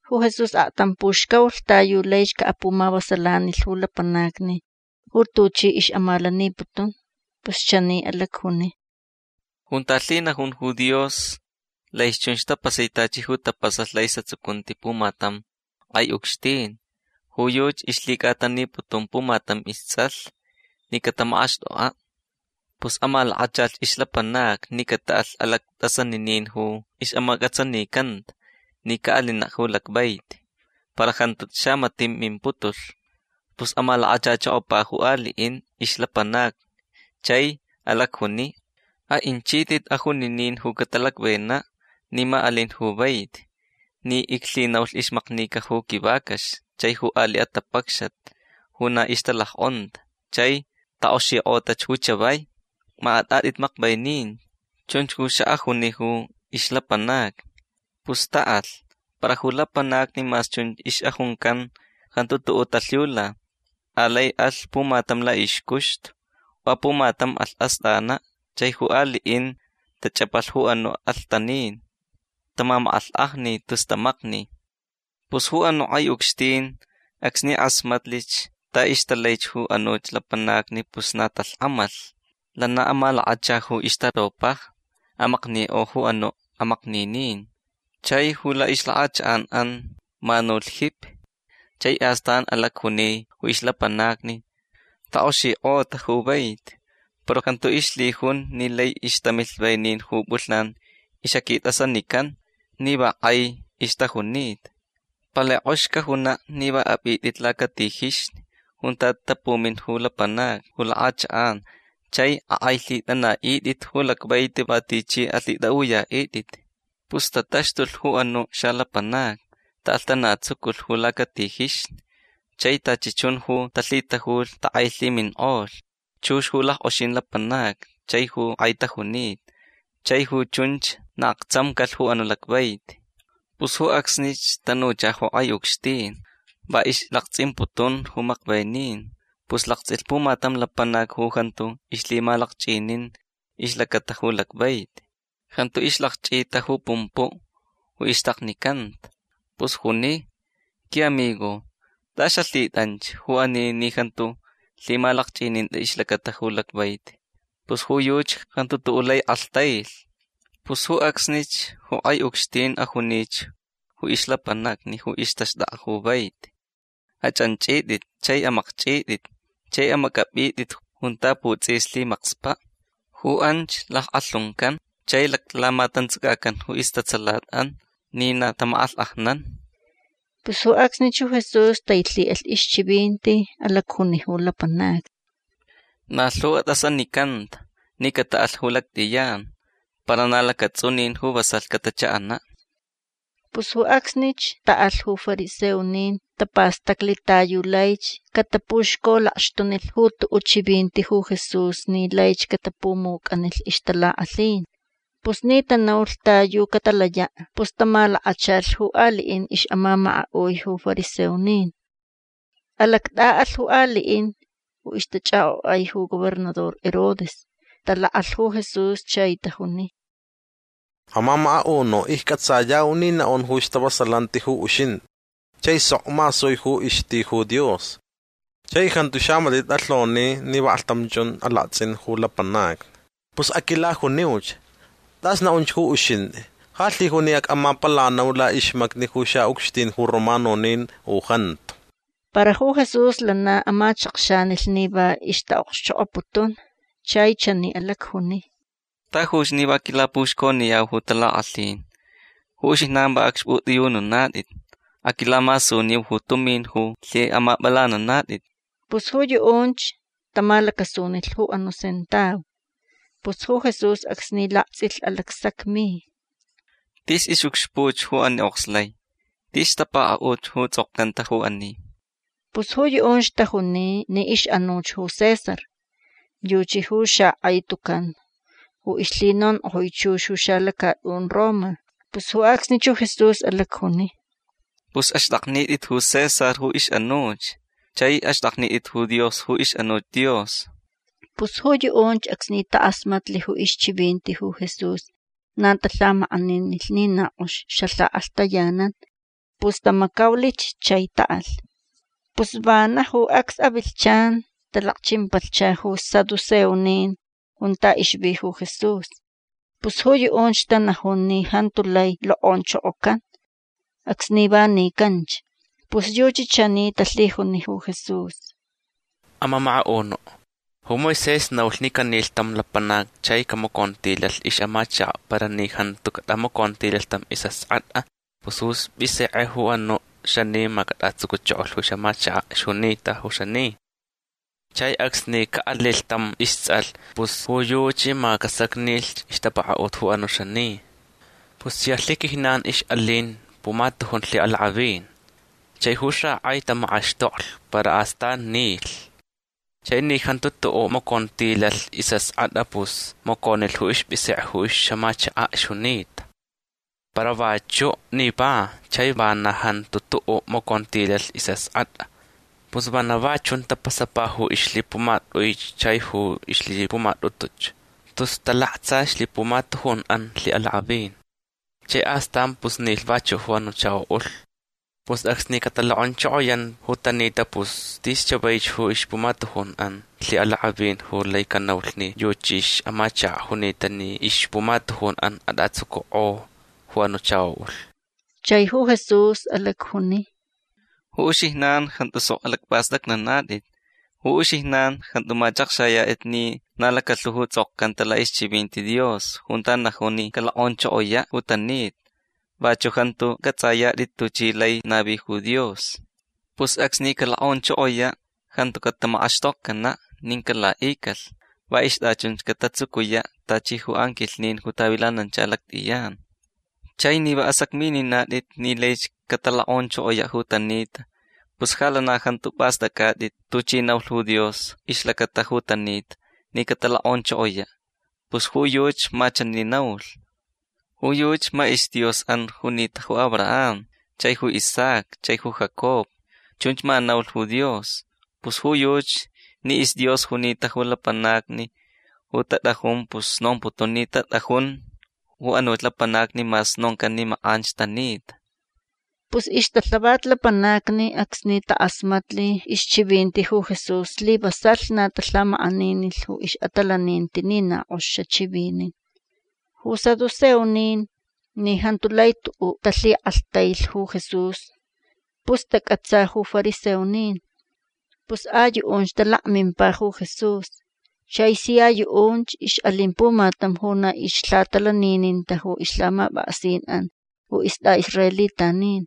Ju Jesús aktam puxcaulh ta yu laich caʼapumavasalanilh ju lapanacni ju tuchi ixʼamalaniputun. Pus chani alacjuni: ―Junta lhinajun ju Dios lai chunch tapasai tachi ju tapasalh laʼisʼatsucunti pumatam kʼai ucxtin. Ju yuchi ixlhicʼataniputun pumatam istsʼalh ni catamakʼaxtʼokʼaʼ. Pus amalakachalh ixlapanacni ni cataʼalh alactʼasaninin ju ixʼamacʼatsanicanta ni caʼalinaʼ ju lacvaiti. Para jantu xamatiʼ mimputulh. Pus amalakachachokopa ju aliʼin ixlapanacni chai alacjuni: “Aʼinchitʼit ajuninin ju catalacvenach ni ma alin ju vaiti ni iclhinaulh ixmaknica ju quivacax chai ju aliʼ atapacxat ju na ixtalackʼonta. Chai takʼoxikʼotach ju chavai. Ma atʼatʼit makvenin”. Chunch ju xaʼajuni ju ixlapanacni. Pus taʼalh. Para ju lapanacni mas chunch ixʼajuncan jantu tuʼuʼ talhiula. Alai alh pumatam laʼixcuxtu. Apumatam alh astʼanaʼ. Chai ju aliʼin tachʼapalh ju anuʼ alhtanin. Tamamakʼalhkʼajni tus tamakni. Pus ju anuʼ kʼai ucxtin acsni kʼasmatlich ta ixtalai ju anuch lapanacni pus na talhkʼamalh. Lana amalakacha ju ixtaropajni. Amaknikʼo ju anuʼ amakninin. Chai ju laʼixlakʼachakʼanʼan manulh jipi. Chai astan alacjuni ju ixlapanacni: “Takʼoxikʼota ju vaiti para jantu ixlhijun ni lai ixtamilh venin ju pʼulhnan ixʼaquitʼasanican ni va kʼai ixtajunita. Palai kʼox cajunaʼ ni va apʼitʼit lacatijixni junta tapumin ju lapanacni ju lakʼachakʼan chai akʼailhitʼanaʼitʼit ju lacvaiti va tichi alhitʼaʼuyaʼitʼit”. Pus tataxtulh ju anuʼ xalapanacni. Taʼalhtanatsuculh ju lacatijixni. Chai tachi chun ju talhitajulh takʼailhiminkʼolh. Chux ju lackʼoxin lapanacni chai ju kʼai tajunita. Chai ju chunch na aktsamcalh ju anuʼ lacvaiti. Pus ju acsnich tanucha ju kʼai ucxtin. Va ixlaktsʼimputun ju makvenin. Pus laktsʼilh pumatam lapanac ju jantu ixlhimalakchʼinin ixlacata ju lacvaiti. Jantu ixlakchʼita ju pumpuʼ ju ixtaknicanta. Pus juni: “Quiʼamigo. Tʼas xalhitʼanch ju ani ni jantu lhimalakchʼininta ixlacata ju lacvaiti”. Pus ju yuchi jantu tuʼuʼ lai kʼalhtailh. Pus ju acsnich ju kʼai ucxtin ajunich ju ixlapanacni ju ixtaxtʼakʼa vaiti: “Achʼanchʼitʼit chai amakchʼitʼit chai amacʼapʼitʼit junta putsʼis lhimakspaʼ. Ju anch lackʼalhuncan chai laclamatantsacacan ju istatsalatʼan ni na tamakʼalhkʼajnan”. Pus ju acsnich ju Jesús tailhiʼalh ixchivinti. Alacjuni ju lapanacni: ―Na lhu atʼasanicanta ni cataʼalh ju lactʼiyan. Para na lacatsʼunin ju vasalh catachaʼanaʼ. Pus ju acsnich taʼalh ju fariseonin. Tapastaclh ta yu laich catapuxcolakxtunilh ju tuʼuʼ chivinti ju Jesús ni laich catapumucʼanilh ixtalakʼalhin. Pus ni tanaulh ta yu catalayaʼ pus tamalakachalh ju aliʼin ixʼamamakaʼui ju fariseonin. Alactʼaʼalh ju aliʼin ju ixtachʼakʼokʼai ju gobernador Herodes. Talakʼalh ju Jesús chai tajuni: ―Amamakaʼunuʼ iccʼatsayau ni naʼun ju stavasalanti ju uxintʼi. Chai sok masui ju ixti ju Dios. Chai jantu xamatiʼ tʼalhoni ni vaklhtam chun ju alaktsʼin ju lapanacni. Pus aquilajuniuch. Tʼas naʼunch ju uxintʼi. Ja lhijun ni acʼamapalanau laʼixmacni ju xaʼucxtin ju romanonin u jantu. Para ju Jesús lana amachakxanilh ni va ixtaʼokxchokʼoputun. Chai chani alacjuni: ―Tajuch ni va quilapuxconiyau ju talakʼalhin. Ju uxijnan va acxpʼutʼiyununatʼit. Aquilamasuniu ju tumin ju lhiʼamapʼalananatʼit. Pus ju yuʼunch tamalacasunilh ju anuʼ sentau. Pus ju Jesús acsni laktsʼilh alacsacmi: ―Tis ixʼucxpuʼ ju ani okslai. Tis ixtapakaʼut ju tsʼokcanta ju ani. Pus ju yuʼunch tajuni ni ixʼanuch ju César. Yuchi ju xakʼai tucan ju ixlhinonkʼojui chux ju xalacatʼun Roma. Pus ju acsnich ju Jesús alacjuni: ―Pus axtʼaknitʼit ju César ju ixʼanuch. Chai axtʼaknitʼit ju Dios ju ixʼanuch Dios. Pus ju yuʼunch acsni takʼasmatlh ju ixchivinti ju Jesús na talhamakʼaninilh ni na kʼox xalhakʼalhtayanan. Pus tamacaulich chai taʼalh. Pus vana ju acs avilhchan talakchimpalhcha ju saduceonin junta ixvi ju Jesús. Pus ju yuʼunch tanajun ni jantu lai lokʼonchokocan acsni va nicanch. Pus yuchi chani talhijuni ju Jesús: ―Amamakaʼunuʼ ju Moisés naulh ni canilh tam lapanac chai camacontilalh ixʼamachakaʼ para ni jantu catʼamacontilalh tam isʼaskʼatʼa pus ju ispʼisekʼe ju anuʼ xani ma catʼatsucuchokolh ju ixʼamachakaʼ ixjunita ju xani. Chai acsni caʼalilh tam istsʼalh pus ju yuchi ma casacnilh ixtapakaʼut ju anuʼ xani. Pus sia lhiquijnan ixʼalin pumatujun lhiʼalakʼavin. Chai ju xakʼai tamakʼaxtoklich para astan nilh. Chai ni jantu tuʼuʼ macontilalh isʼaskʼatʼa pus maconilh ju ispʼisekʼe ju ixʼamachakaʼ ixjunita. Para vachuʼ nipa chai vana jantu tuʼuʼ macontilalh isʼaskʼatʼa. Pus vana va chun tapasapa ju ixlhipumatʼuich chai ju ixlhipumatʼutuch. Tus talaktsa ixlhipumatujunʼan lhiʼalakʼavin. Chai astanch pus nilh vachuʼ ju anuʼ chakoʼulh. Pus acsni catalokʼonchokoyanta ju tanita pus tis chavaich ju ixpumatujunʼan lhiʼalakʼavin ju lai canaulh ni yuchi ixʼamachakach junita ni ixpumatujunʼan atʼatsucukʼo ju anuʼ chakoʼulh. Chai ju Jesús alacjuni: ―Ju uxijnan jantu sok alacpʼastʼacnanatʼit. Ju uxijnan jantu machʼakxayatʼit ni na lacalhu ju tsʼokcanta laʼixchivinti Dios junta najun ni calokʼonchokoyaʼ ju tanita. Vachuʼ jantu cʼatsʼayatʼit tuchi lai navi ju Dios. Pus acsni calokʼonchokoyaʼ jantu catamakʼaxtokcanaʼ nin calaʼicalh. Va ixtʼachunch catatsucuyaʼ tachi ju anquilhnin ju tavilanancha lactʼiyan. Chai ni va asacmininatʼit ni laich catalokʼonchokoyaʼ ju tanita pus ja lana jantu pʼastʼacʼatʼit tuchi naulh ju Dios ixlacata ju tanita ni catalokʼonchokoyaʼ. Pus ju yuchi ma chani naulh: Ju yuchi ma isDiosʼan junita ju Abraham chai ju Isaac chai ju Jacob. Chunch ma naulh ju Dios. Pus ju yuchi ni isDios junita ju lapanacni ju tatʼajun pus nomputun ni tatʼajun ju anuch lapanacni mas noncan ni makʼanch tanita. Pus ixtalhavat lapanacni acsni takʼasmatli ixchivinti ju Jesús slivasalh na talhamakʼaninilh ju ixʼatalaninti ni na kʼox xachivinin. Ju saduceonin ni jantu lai tuʼuʼ talhikʼalhtailh ju Jesús pus tacʼatsa ju fariseonin. Pus a yuʼunch talakmimpa ju Jesús. Chai sia yuʼunch ixʼalin pumatam ju na ixlhatalanininta ju ixlhamapʼaksinʼan ju istʼaʼisraelitanin.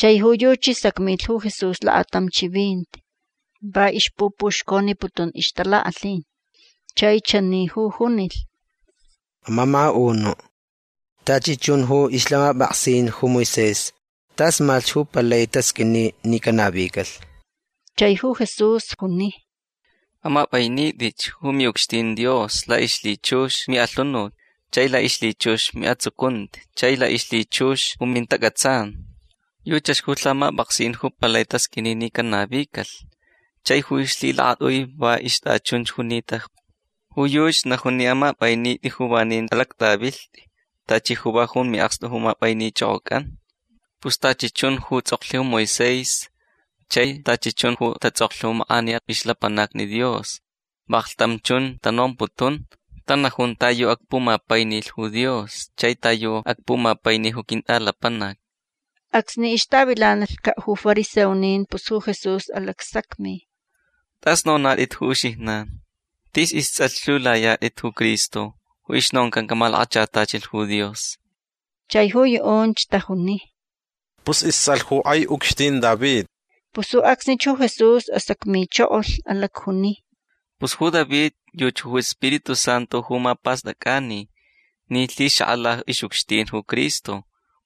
Chai ju yuchi sacmilh ju Jesús lakatam chivinti. Va ixpupuxconiputun ixtalakʼalhin. Chai chani ju junilh: ―Amamakaʼunuʼ tachi chun ju ixlhamapʼaksin ju Moisés tas malhch ju palai tasqʼuini ni canavicalh. Chai ju Jesús juni: ―Amapʼainitʼich ju miʼucxtin Dios laʼixlhichux miʼalhunut chai laʼixlhichux ju miʼatsucunti chai laʼixlhichux ju mintacʼatsan. Yuchach ju lhamapʼaksin ju palai tasqʼuini ni canavicalh. Chai ju ixlhilakatʼui va ixtʼachunch junita. Ju yuchi najun ni amapʼainitʼi ju vanin alactʼavilhtʼi tachi ju va jun miʼakstu ju mapʼainichʼokʼocʼan. Pus tachi chun ju tsʼoklh ju Moisés chai tachi chun ju tatsʼoklh ju makʼaniya ixlapanacni Dios vaklhtam chun tanomputun. Tanajun ta yu acpumapainilh ju Dios chai ta yu acpumapaini ju quintʼalapanac. Acsni ixtavilanalhcaʼ ju fariseonin pus ju Jesús alacsacmi: ―Tʼas nonatʼit ju uxijnan. Tis istsʼalh lhiulayatʼit ju Cristo ju ixnoncan camalakachatachilh ju Dios. Chai ju yuʼunch tajuni: ―Pus istsʼalh ju kʼai ucxtin David. Pus ju acsnich ju Jesús asacmichokolh. Alacjuni: ―Pus ju David yuchi ju Spiritu Santu ju mapastʼacʼani ni lhixakʼala ixʼucxtin ju Cristo.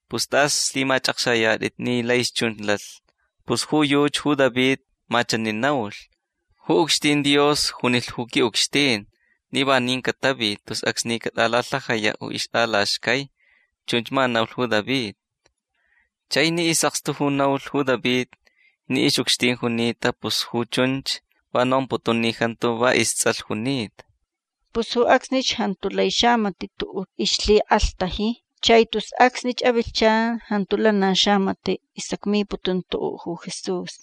Pus tʼas lhimachʼakxayatʼit ni lai chunch lalh. Pus ju yuchi ju David ma chani naulh: Ju ucxtin Dios junilh ju quiʼucxtin ni vanin catavi tus acsni catʼalalhajayaʼ ju ixtʼalaxcai. Chunch ma naulh ju David. Chai ni isʼakstu ju naulh ju David ni ixʼucxtin junita pus ju chunch va nomputun ni jantu va istsʼalh junita. Pus ju acsnich jantu lai xamatiʼ tuʼuʼ ixlhikʼalhtaji. Chai tus acsnich avilhchan jantu lana xamatiʼ isacmiputun tuʼuʼ ju Jesús.